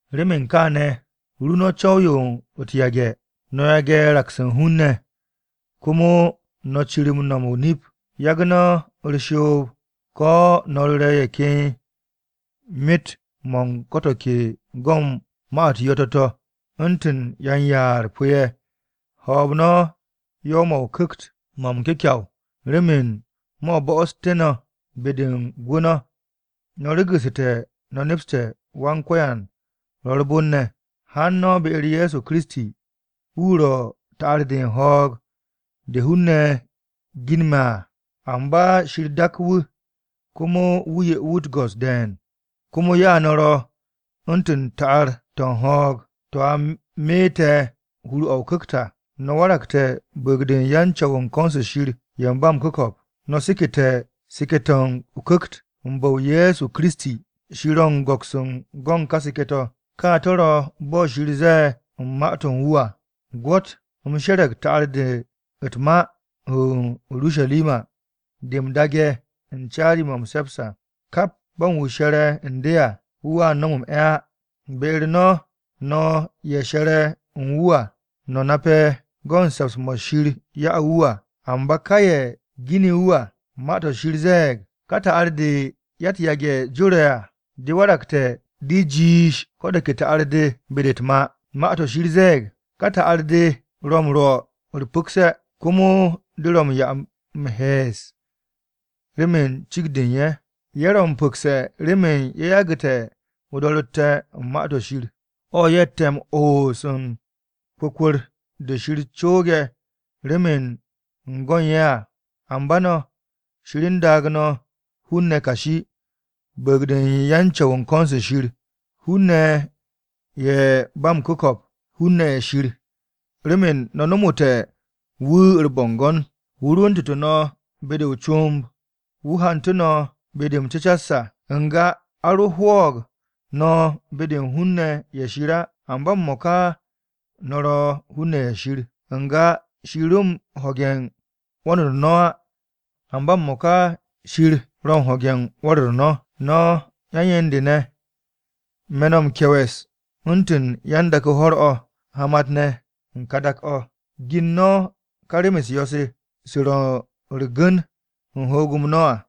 Remen kaane̱, ru no̱ co̱w-yo u̱t-yage̱, no̱ yage̱ raks u̱n hun-ne̱, komo no̱ cir m-nom o-nip. Yagu̱ no̱ u̱r-shoob ko̱ no̱ ru̱re̱ ye̱ ken myet-mo̱ u̱n ko̱ to̱ ke go̱n ma-u̱t yo̱-to̱ to̱. U̱ntu̱n yan-yaar pu̱-ye̱, ho̱o̱b no̱ yo̱w-mo̱ o-Ku̱kt mo̱ m-kyu̱kyaw remen mo̱ bo̱'o̱ssu̱té̱ no̱ be-de u̱n gwu̱ no̱. No̱ be'este̱ no̱ nepste̱ Wan-Ko̱yan ro̱ u̱r-bon ne̱. Haan no̱ be-u̱r Ye̱so Kiristi. Wu̱ ro̱ ta'ar-de u̱n ho̱o̱g de hun-ne̱ ginme̱ à, amba Shir dak wu̱ komo wu̱ 'ye wu̱ u̱t-go̱s de̱e̱n. Komo ya no̱ ro̱ u̱ntu̱n ta'ar-to̱ u̱n ho̱o̱g, to̱ a meete̱ hur-o̱ o-Ku̱kt à. No̱ waragte̱ bu̱u̱g-de u̱n yan-Co̱w u̱n ko̱n-se Shir ye̱ u̱n ba m-ku̱ko̱p, no̱ sekete̱ seke̱-to̱ o-Ku̱kt u̱n bu̱-o Ye̱so Kiristi. Shir ro̱ m-go̱ks go̱n ka seke̱-to̱. Ka to̱ ro̱ bo̱ Shir ze̱e̱ u̱n Ma-to̱ u̱n wu̱ à: “Gwo̱t, u̱m she̱re̱g ta'ar-de u̱t-ma o-Urusharima de m-daage̱ u̱n caari-mo̱ m-se̱ps à. Kap bo̱ u̱n wu̱ she̱re̱ u̱n de à wu̱a nom m-'e̱ á.” Be-u̱r no̱, no̱ ye̱ she̱re̱ u̱n wu̱ à no̱ nape̱ go̱ u̱n se̱ps-mo̱ Shir ya'u̱ wu̱ à. Amba ka ye̱ gini wu̱ à. Ma-to̱ Shir ze̱e̱g, “Ka ta'ar-de ya-u̱t-ma jore̱ à, de waragte̱ de jiish ko̱ de ke ta'ar-de u̱n be-de u̱t-ma.” Ma-to̱ Shir ze̱e̱g, “Ka ta'ar-de ro̱ m-rwo̱ u̱r-pu̱kse̱, komo de ro̱ ye̱ m-he̱e̱s remen cikt-de u̱n ye̱.” Ye̱ ro̱ m-pu̱kse̱ remen ye̱ yagu̱te̱ o-do̱ro̱tte̱ u̱n Ma-to̱ Shir, o̱ ye̱tte̱ m-oos u̱n kwu̱kwu̱r-de Shir cooge̱ remen u̱n go̱ u̱n ye̱ à. Amba no̱, Shir u̱n daag no̱ hun-ne̱ kashi, bu̱u̱g-de yan-Co̱w u̱n ko̱n-se Shir, hun-ne̱ ye̱ ba m-ku̱ko̱p, hun-ne̱ ye̱ Shir, remen no̱ nomoté̱ wu̱ u̱r-bo̱ngo̱n. Wu̱ rwu̱ntu̱tu̱ no̱ be-de o-comb, wu̱ hantu̱ no̱ be-de m-cu̱cas. N-ga a ro hwo̱o̱g no̱ be-de u̱n hun-ne̱ ye̱ Shir á, amba m-mo̱ka no̱ ro̱ hun-ne̱ ye̱ Shir. N-ga Shir ro m-ho̱ge̱ u̱n 'wo̱n-u̱r no̱ á, amba m-mo̱ka Shir o̱ ho̱ge̱ u̱n 'wo̱n-u̱r no̱. No̱ yan-yen-de ne̱, me̱ no̱ m-kye̱we̱s, u̱ntu̱n yan-dak-o ho̱r-o̱, hamat-ne̱ u̱n ka dak-o̱, gin no̱ ka rem-u̱s yo̱-se, se ro̱ u̱r-gu̱n u̱n ho̱o̱g-m no̱ à.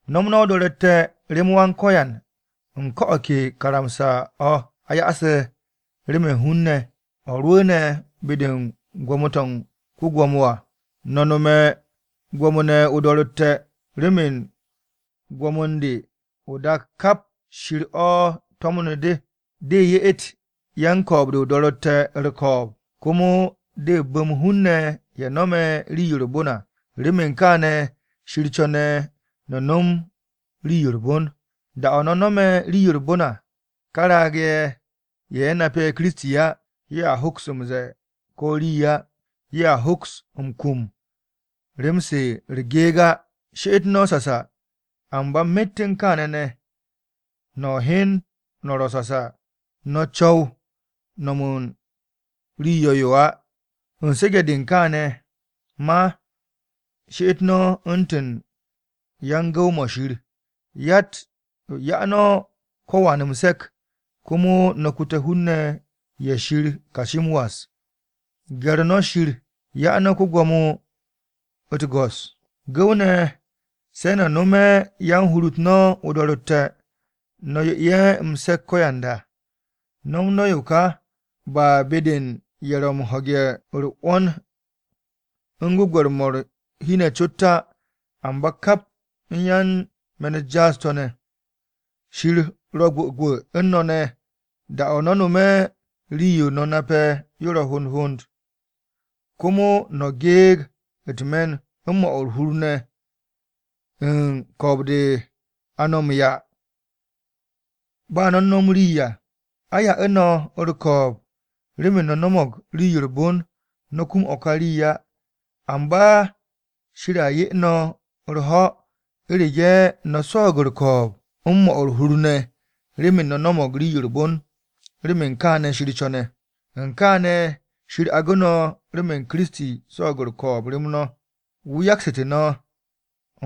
No̱m no̱ o-do̱ro̱tte̱ rem Wan-Ko̱yan u̱n ko̱ o̱ ke karamsa-o̱ a ya'ase̱ remen hun-ne̱, o̱ rwu̱u̱ne̱ be-de u̱n gwo̱mo-to̱ u̱n ko-gwo̱mo à. No̱ nome̱ gwo̱mo-ne̱ o-do̱ro̱tte̱, remen gwo̱mo-de o-dak kap Shir o̱ to̱mnu̱ de, de ye'et yan-ko̱o̱b-de o-do̱ro̱tte̱ u̱r-ko̱o̱b komo de bu̱m hun-ne̱ ye̱ no̱me̱ rii-yo u̱r-bon à. Remen kaane̱ Shir co̱ne̱ no̱ nom rii-yo u̱r-bon. Da-o̱ no̱ no̱me̱ rii-yo u̱r-bon à, ká raag-ne̱ ye̱, ye̱ nape̱ Kiristi á, ye̱a hoks m-ze̱e̱ ko̱ rii á. Ye̱a hoks m-kum rem-se u̱r-geeg á. She'et no̱ sasa, amba myet u̱n kaane̱ ne̱, no̱ hyan no̱ ro̱ sasa no̱ cu̱w nom u̱n rii yo̱-yo á. U̱n su̱ge̱-de u̱n kaane̱ ma, she'et no̱ u̱ntu̱n yan-gu̱w-mo̱ Shir. 'Ya no̱ ko̱wan m-se̱k. Komo no̱ kute̱ hun-ne̱ ye̱ Shir kashi m-was. Gye̱r no̱ Shir, 'ya no̱ ko-gwo̱mo u̱t-go̱s. Gu̱w-ne̱, se̱ no̱ no̱me̱ yan-hur-u̱t no̱ o-do̱ro̱tte̱ no̱ 'ye ye̱ m-se̱k ko̱yanda. No̱m no̱ yo ka, ba be-de u̱n ye̱ ro̱ m-ho̱ge̱ u̱r-'wo̱n u̱n gwu̱gwe̱r-mo̱ u̱r-hi ne̱ cot á, amba kap u̱n yan-me̱n-u̱t jaas-to̱ ne̱. Shir ro̱ gwu̱gwu̱ u̱n no̱ ne̱ da-o̱ no̱ no̱me̱ rii-yo no̱ nape̱ yo ro̱ hond hond, komo no̱ geeg u̱t-me̱n u̱n 'mo̱ u̱r-hur ne̱ u̱n ko̱o̱b-de a no̱ m-'ya ba no̱ u̱n no̱m rii à. A 'ye no̱ u̱r-ko̱o̱b remen no̱ no̱mo̱g rii-yo ba u̱r-bon, no̱ kum o̱ ka rii á. Amba Shir a 'ye no̱ u̱r-ho̱, u̱rege̱ no̱ swo̱o̱g u̱r-ko̱o̱b u̱n 'mo̱ u̱r-hur ne̱ remen no̱ no̱mo̱g rii-yo u̱r-bon, remen kaane̱ Shir co̱ne̱. U̱n kaane̱, Shir agu̱ no̱ remen Kiristi swo̱o̱g u̱r-ko̱o̱b rem no̱. Wu̱ yaksu̱tu̱ no̱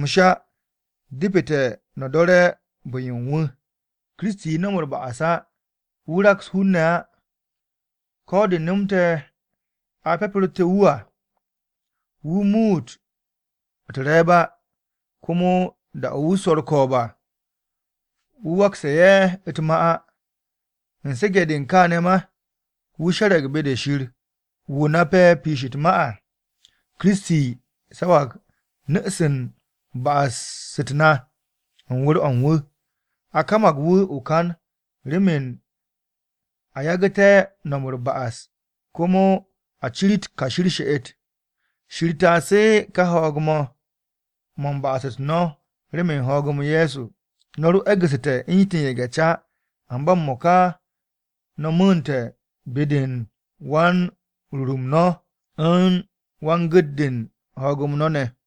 m-sha, depete̱ no̱ do̱re̱ bu̱-yo u̱n wu̱. “Kiristi no̱m u̱r-ba'as á, Wu̱ raks hun-ne̱ á.” Ko̱ de nomte̱ a pyapu̱rtu̱ wu̱ à, wu̱ muut u̱t-re̱e̱b á. Komo da-o̱ wu̱ swo̱ u̱r-ko̱o̱b à, wu̱ waksu̱ ye̱ u̱t-ma á. U̱n su̱ge̱-de u̱n kaane̱ ma, wu̱ she̱re̱g be-de Shir, wu̱ nape̱ piish u̱t-ma à. Kiristi sawag nu̱-se u̱n ba'as-u̱t na u̱n wu̱r-o̱ u̱n wu̱. A kamag wu̱ o-kan remen a yagu̱té̱ no̱m u̱r-ba'as komo a cirit kashi u̱r-she'et. Shir taasu̱ ka hoog-mo̱ mo̱ u̱n ba'as-u̱t no̱ remen hoog-m Ye̱so. No̱ ro e̱gu̱ssu̱te̱ u̱ntu̱n ye̱ge̱-ca, amba m-mo̱ka no̱ mu̱u̱nte̱ be-de u̱n wan-Ruut-m no̱ u̱n wan-Gu̱t-de u̱n ho̱o̱g-m no̱ ne̱.